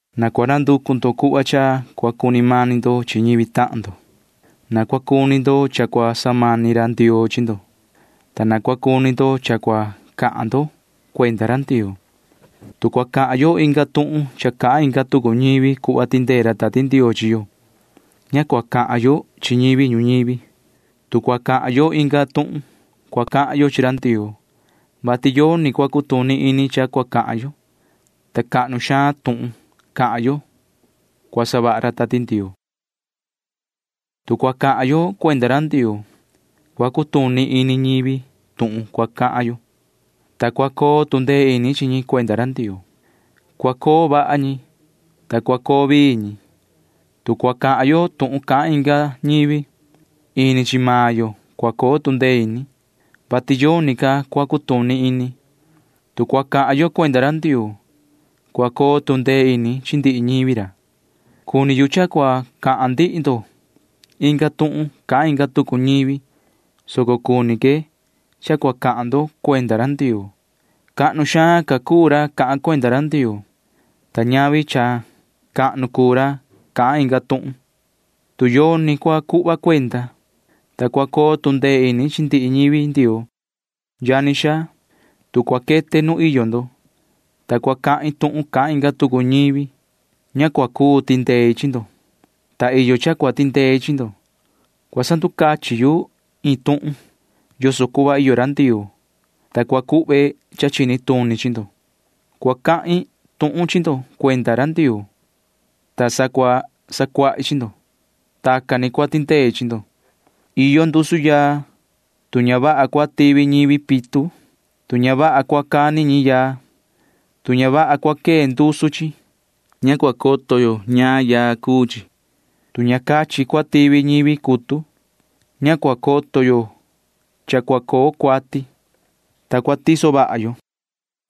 Na cua nanducu ndo cuhva cha cua cuni mani ndo chi ñivi tahan ndo. Na cua cuni ndo cha cua samani ra Ndioo chi ndo, ta na cua cuni ndo cha cua cahan ndo cuenda ra Ndioo. Tu cua cahan yo inga tuhun cha cahan inga tucu ñivi cuhva tindee ra Tati Ndioo chi yo, ña cua cahan yo chi ñivi ñuñivi. Tu cua cahan yo inga tuhun, cua cahan yo chi ra Ndioo, vati yoni cua cutuni ini cha cua cahan yo, ta cahnu xaan tuhun cahan yo cua savaha ra Tati Ndioo. Tu cua cahan yo cuenda ra Ndioo, cua cutuni ini ñivi tuhun cua cahan yo, ta cua coo tu ndee ini chi ñi cuenda ra Ndioo. Cua coo vaha ñi, ta cua coo vii ñi. Tu cua cahan yo tuhun cahan inga ñivi, ini chi maan yo cua coo tu ndee ini, [vati yoni ca cua cutuni ini]. Tu cua cahan yo cuenda ra Ndioo, cua coo tu ndee ini chi ndihi ñivi ra. Cuni yu cha cua cahan ndihi ndo inga tuhun cahan inga tucu ñivi, soco cuni que cha cua cahan ndo cuenda ra Ndioo. Cahnu xaan ca cuu ra cahan cuenda ra Ndioo, ta ñavi cha cahnu cuu ra cahan inga tuhun, tu yoni cua cuhva cuenda, ta cua coo tu ndee ini chi ndihi ñivi Ndioo. Yani xaa, tu cua quete nu iyo ndo, ta cua cahin tuhun cahan inga tucu ñivi, ña cua cuu tindei chi ndo, ta iyo cha cua tindei chi ndo. Cua sanducachin yu iin tuhun yoso cuhva iyo ra Ndioo, ta cua cuhve cha chini tuni chi ndo. Cua cahin tuhun chi ndo cuenda ra Ndioo, ta cua sacuahi chi ndo. Tacan ni cua tindei chi ndo. Iyo ndusu yaa. Tu ña vaha cua tivi ñivi pitu, tu ña vaha cua cani ñi yaa, tu ña vaha cua quee ndusu chi, ña cua coto yo ñaan yaa cuu chi. Tu ña cachin cua tivi ñivi cutu, ña cua coto yo cha cua coo cuati, ta cua tiso vaha yo.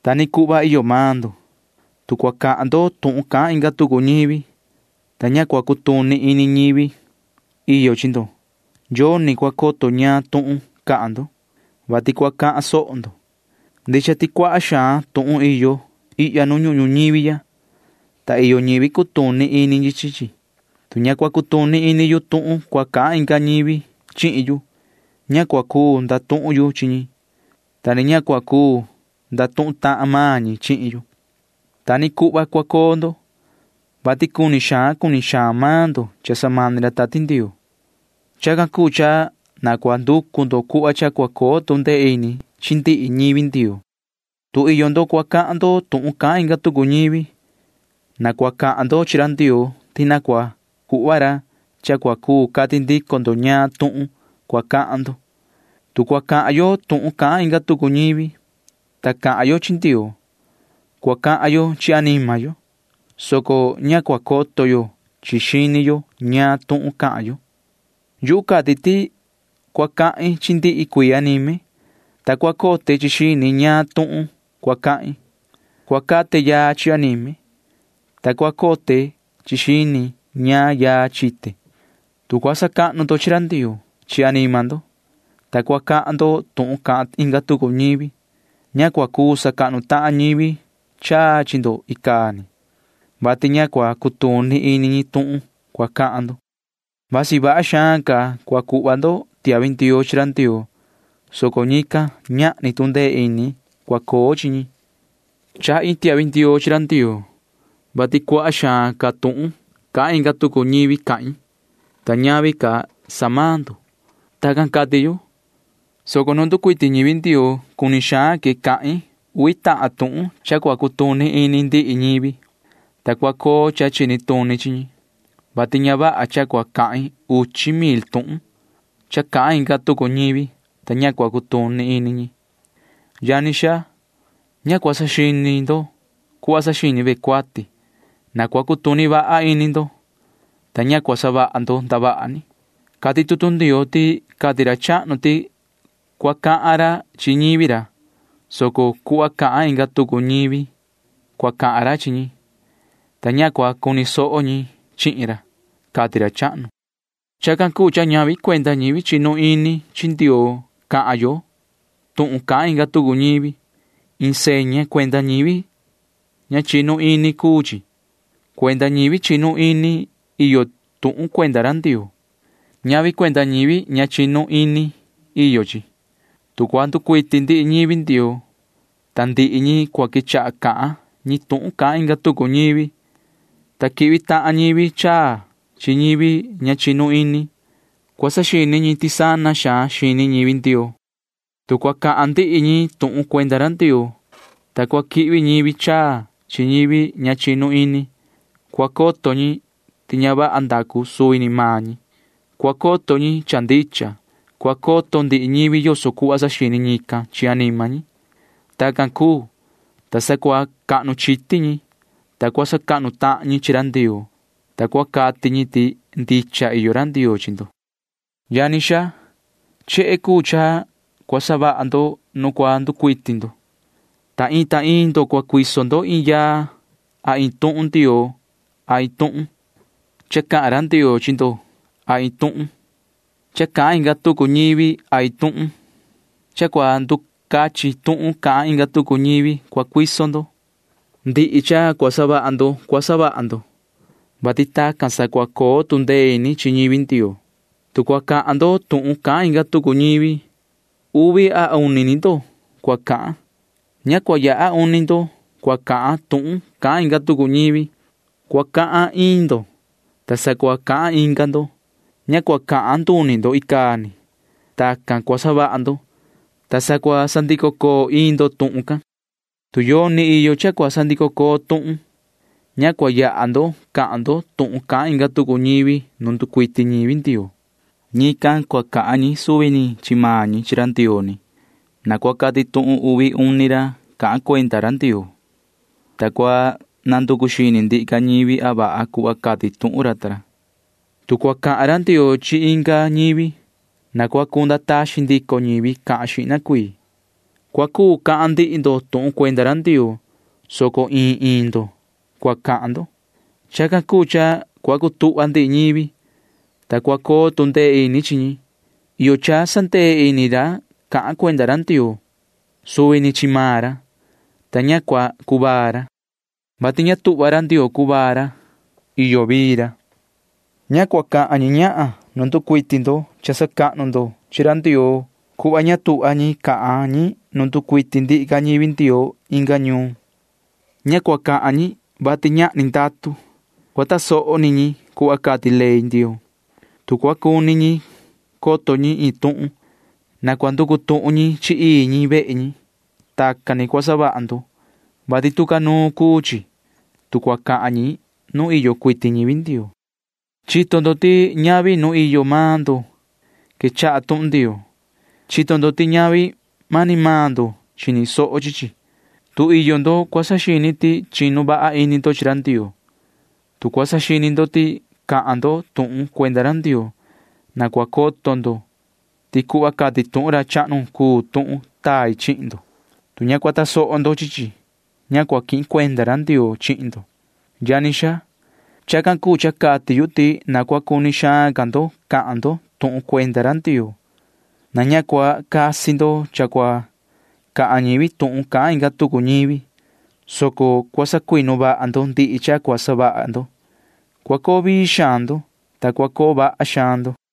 Ta ni cuhva iyo maan ndo. Tu cua cahan ndo tuhun cahan inga tucu ñivi, ta ña cua cutuni ini ñivi iyo chi ndo, yoni cua coto ñaan tuhun cahan ndo, vati cua cahan soho ndo. Ndicha ti cuaha xaan tuhun iyo ihya nu ñuhun ñuñivi ya, ta iyo ñivi cutuni ini ñi chi chi. Tu ña cua cutuni ini yu tuhun cua cahan inga ñivi chihin yu, ña cua cuu ndatuhun yu chi ñi, ta ni ña cua cuu ndatuhun tahan maan ñi chihin yu. Ta ni cuhva cua coo ndo, vati cuni xaan cuni xaan maan ndo cha samani ra Tati Ndioo. Chacan cuu cha na cua nducu ndo cuhva cha cua coo tu ndee ini chi ndihi ñivi Ndioo. Tu iyo ndo cua cahan ndo tuhun cahan inga tucu ñivi, na cua cahan ndo chi ra Ndioo ti na cua cuhva ra cha cua cuu cati ndico ndo ñaan tuhun cua cahan ndo. Tu cua cahan yo tuhun cahan inga tucu ñivi, ta cahan yo chi Ndioo, cua cahan yo chi anima yo, soco ña cua coto yo chi xini yo ñaan tuhun cahan yo. Yuhu cati ti cua cahin chi ndihi cuii anime, ta cua cote chi xini ñaan tuhun cua cahin. Cua cate yaa chi anime, ta cua cote chi xini ñaan yaa chite. Tu cua sacahnu ndo chi ra Ndioo chi anima ndo, [ta cua cahan ndo tuhun cahan inga tucu ñivi,] ña cua cuu sacahnu tahan ñivi chaa chi ndo icaa ni, vati ña cua cutuni ini ñi tuhun cua cahan ndo. Vasi vaha xaan cua cuhva ndo tiahvi ndioo chi ra Ndioo, soco ñican―ñahni tu ndee ini cua coo chi ñi. Chahi iin tiahvi ndioo chi ra Ndioo, vati cuaha xaan ca tuhun cahan inga tucu ñivi cahin, ta ñavi ca sa maan ndo. Tacan cati yu, soco nu nducuiti ñivi Ndioo cuni xaan que cahin uvi tahan tuhun cha cua cutuni ini ndihi ñivi, ta cua coo cha chini tuni chi ñi, vati ña vaha cha cua cahin uchi mil tuhun cha cahan inga tucu ñivi, ta ña cua cutuni ini ñi. Yani xaa, ña cua saxini ndo cuhva saxini ve cuati. Na cua cutuni vaha ini ndo, ta ña cua savaha ndo ndavaha ni. Cati tutu Ndioo ti cati ra chahnu ti cua cahan ra chi ñivi ra, soco cuhva cahan inga tucu ñivi cua cahan ra chi ñi, ta ña cua cuni soho ñi chihin ra, cati ra chahnu. Chacan cuu cha ñavi cuenda ñivi chinu ini chi Ndioo cahan yo tuhun cahan inga tucu ñivi. Iin seña cuenda ñivi ña chinu ini cuu chi. Cuenda ñivi chinu ini iyo tuhun cuenda ra Ndioo. Ñavi cuenda ñivi ña chinu ini iyo chi. Tu cua nducuiti ndihi ñivi Ndioo, ta ndihi ñi cua quechaha cahan ñi tuhun cahan inga tucu ñivi, ta quihvi tahan ñivi chaa chi ñivi ña chinu ini, cua saxini ñi ti sana xaan xini ñivi Ndioo. Tu cua cahan ndihi ñi tuhun cuenda ra Ndioo, ta cua quihvi ñivi chaa chi ñivi ña chinu ini, cua coto ñi ti ña vaha ndacu suvi ni maan ñi. Cua coto ñi cha ndicha. Cua coto ndihi ñivi yoso cuhva saxini ñican chi anima ñi. Tacan cuu, ta sa cua cahnu chiti ñi, ta cua sacahnu tahan ñi chi ra Ndioo, ta cua cati ñi ti ndicha iyo ra Ndioo chi ndo. Yani xaa, chehe cuu cha cua savaha ndo nu cua nducuiti ndo. Ta iin ta iin ndo cua cuiso ndo iin yaa a iin tuhun Ndioo a iin tuhun cha cahan ra Ndioo chi ndo a iin tuhun cha cahan inga tucu ñivi a iin tuhun cha cua nducachin tuhun cahan inga tucu ñivi cua cuiso ndo. Ndihi cha cua savaha ndo cua savaha ndo, vati tacan sa cua coo tu ndee ini chi ñivi Ndioo. Tu cua cahan ndo tuhun cahan inga tucu ñivi, uvi a uni ni ndo cua cahan. Ña cua yaha uni ndo cua cahan tuhun cahan inga tucu ñivi. Cua cahan iin ndo, ta sa cua cahan inga ndo. Ña cua cahan nduni ndo icaa ni. Tacan cua savaha ndo, ta sa cua sandico coo iin ndo tuhun can. Tu yoni iyo cha cua sandico coo tuhun, ña cua yaha ndo cahan ndo tuhun cahan inga tucu ñivi nu nducuiti ñivi Ndioo. Ñican cua cahan ñi suvi ni chi maan ñi chi ra Ndioo ni. Na cua cati tuhun uvi uni ra cahan cuenda ra Ndioo, ta cua nanducu xini ndihi ca ñivi a vaha cuhva cati tuhun ra ta ra. Tu cua cahan ra Ndioo chi inga ñivi, na cua cunda taxin ndico ñivi cahan xihna cuii. Cua cuu cahan ndihi ndo tuhun cuenda ra Ndioo, soco iin iin ndo cua cahan ndo. Chacan cuu cha cua cutuhva ndihi ñivi, ta cua coo tu ndee ini chi ñi. Iyo cha sandee ini ra cahan cuenda ra Ndioo suvi ni chi maan ra, [ta ña cua cuvaa ra,] vati ña tuhva ra Ndioo cuvaa ra. Iyo vii ra. Ña cua cahan ñi ñahan nu nducuiti ndo cha sacahnu ndo chi ra Ndioo cuhva ña tuhva ñi cahan ñi nu nducuiti ndihi ca ñivi Ndioo inga ñuun. Ña cua cahan ñi, vati ñahni ndatu. Cua tasoho ni ñi cuhva cati ley Ndioo. Tu cua cuni ñi coto ñi iin tuhun, na cua nducu tuhun ñi chi ii ñi vehe ñi. Tacan ni cua savaha ndo, vati tu ca nuun cuu chi, tu cua cahan ñi nu iyo cuiti ñivi Ndioo. Chito ndo ti ñavi nu iyo maan ndo quechaha tuhun Ndioo. Chito ndo ti ñavi mani maan ndo chini soho chi chi. Tu iyo ndo cua saxini ti chinu vaha ini ndo chi ra Ndioo, tu cua saxini ndo ti cahan ndo tuhun cuenda ra Ndioo, na cua coto ndo ti cuhva cati tuhun ra chahnu cuu tuhun tai chihin ndo. Tu ña cua tasoho ndo chi chi, ña cua quihin cuenda ra Ndioo chihin ndo. Yani xaa, chacan cuu cha cati yu ti na cua cuni xaan ndo cahan ndo tuhun cuenda ra Ndioo. Na ña cua casi ndo cha cua cahan ñivi tuhun cahan inga tucu ñivi, soco cua sacuinu vaha ndo ndihi cha cua savaha ndo. Cua coo vii xaan ndo, ta cua coo vaha xaan ndo.